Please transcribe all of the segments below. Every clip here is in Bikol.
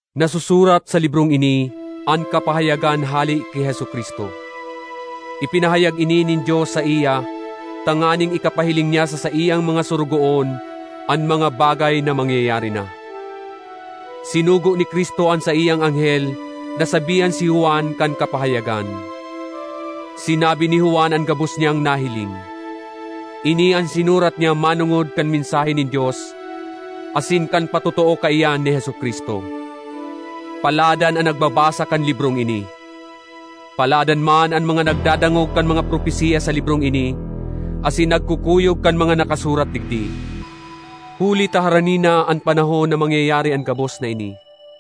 Nasusurat sa librong ini an kapahayagan hale ki Jesu-Cristo. Ipinahayag ini nin Dios saiya tanganing ikapahiling niya sa saiyang mga sorogoon an mga bagay na mangyayari na. Sinugo ni Cristo an saiyang anghel na sabihan si Juan kan kapahayagan. Sinabi ni Juan an gabos niyang nahiling. Ini an sinurat niya manongod kan mensahe nin Dios asin kan patotoo kaiyan ni Jesu-Cristo. Paladan an nagbabasa kan librong ini; paladan man an mga nagdadangog kan mga propesiya sa librong ini asin nagkukuyog kan mga nakasurat digdi, huli ta harani na an panahon na mangyayari an gabos na ini.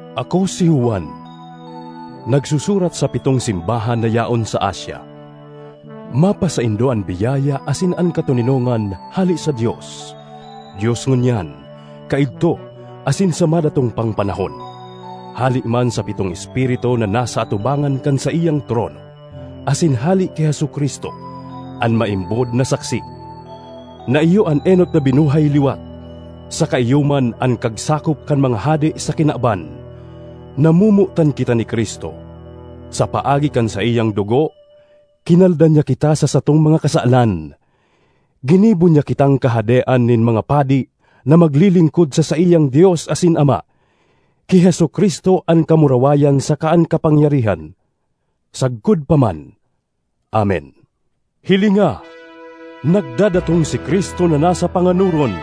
Ako, si Juan, nagsusurat sa pitong simbahan na yaon sa Asia: Mapasaindo an biyaya asin an katoninongan hale sa Dios—Dios ngunyan, kaidto, asin sa madatong pang panahon—hale man sa pitong espiritu na nasa atubangan kan saiyang trono, asin hale ki Jesu-Cristo, an maimbod na saksi, na iyo an enot na binuhay liwat, saka iyo man an kagsakop kan mga hade sa kinaban. Namomotan kita ni Cristo. Sa paagi kan saiyang dugo, kinalda niya kita sa satong mga kasalan. Ginibo niya kitang kahadean nin mga padi na maglilingkod sa saiyang Dios asin Ama. Ki Jesu-Cristo an kamurawayan saka an kapangyarihan sagkod pa man! Amen. Hilinga! Nagdadatong si Cristo na nasa panganoron!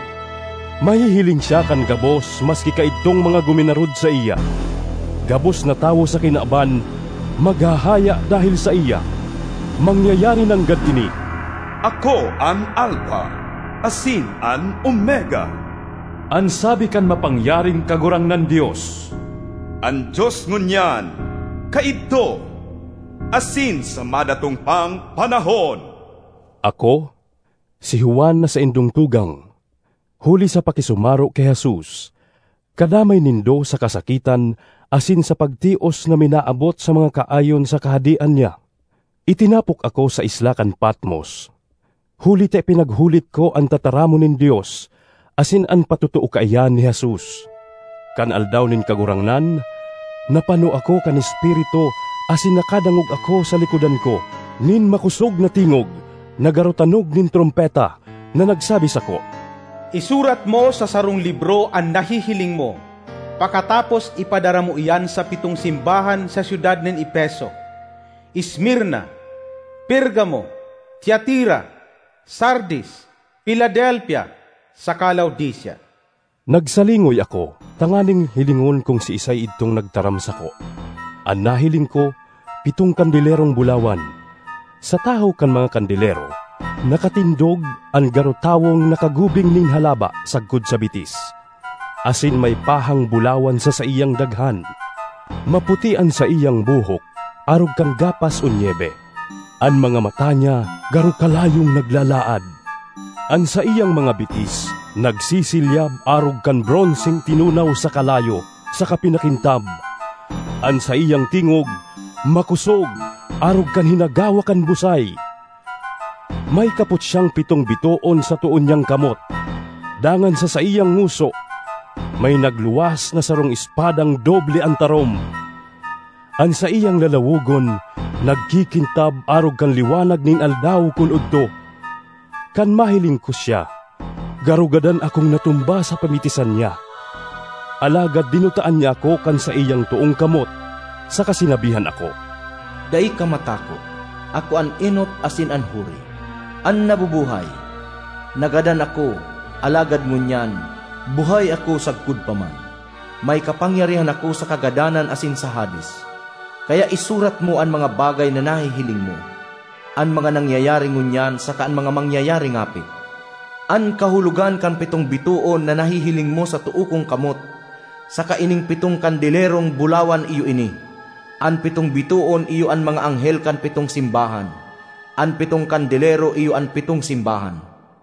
Mahihiling siya kan gabos maski kaidtong mga guminarod saiya. Gabos na tawo sa kinaban maghahaya dahel saiya. Mangyayari nanggad ini! ”Ako an Alfa asin an Omega,” an sabi kan Mapangyaring Kagurangnan Dios—”an Dios ngunyan, kaidto, asin sa madatong pang panahon. Ako, si Juan na saindong tugang, huli sa pakisumaro ki Jesus, kadamay nindo sa kasakitan asin sa pagtios na minaabot sa mga kaayon sa Kahadean niya. Itinapok ako sa isla kan Patmos huli ta ipinaghulit ko an tataramon nin Dios asin an patotoo kaiyan ni Jesus. Kan Aldaw nin Kagurangnan, napano ako kan Espiritu asin nakadangog ako sa likodan ko nin makosog na tingog na garo tanog nin trompeta, na nagsabi sako, “Isurat mo sa sarong libro an nahihiling mo, pakatapos ipadara mo iyan sa pitong simbahan sa syudad nin Efeso, Esmirna, Pergamo, Tiatira, Sardis, Filadelfia saka Laodicea.” Nagsalingoy ako tanganing hilingon kun siisay idtong nagtaram sako; an nahiling ko pitong kandelerong bulawan. Sa tahaw kan mga kandelero, nakatindog an garo tawong nakagubing nin halaba sagkod sa bitis asin may pahang bulawan sa saiyang daghan. Maputi an saiyang buhok arog kan gapas o nyebe; an mga mata niya garo kalayong naglalaad. An saiyang mga bitis nagsisilyab arog kan bronseng tinunaw sa kalayo saka pinakintab; an saiyang tingog makosog arog kan hinagawak kan busay. May kapot siyang pitong bitoon sa too niyang kamot, dangan sa saiyang ngoso may nagluwas na sarong espadang doble an tarom. An saiyang lalawogon nagkikintab arog kan liwanag nin aldaw kun odto. Kan mahiling ko siya, garo gadan akong natumba sa pamitisan niya. Alagad dinutaan niya ako kan saiyang toong kamot saka sinabihan ako, “Dai ka matakot! Ako an enot asin an huri; an Nabubuhay! Nagadan ako, alagad ngunyan, buhay ako sagkod pa man. May kapangyarihan ako sa kagadanan asin sa Hades. Kaya isurat mo an mga bagay na nahihiling mo, an mga nangyayari ngunyan saka an mga mangyayari ngapit. An kahulogan kan pitong bitoon na nahihiling mo sa too kong kamot, saka ining pitong kandelerong bulawan iyo ini: an pitong bitoon iyo an mga anghel kan pitong simbahan; an pitong kandelero iyo an pitong simbahan.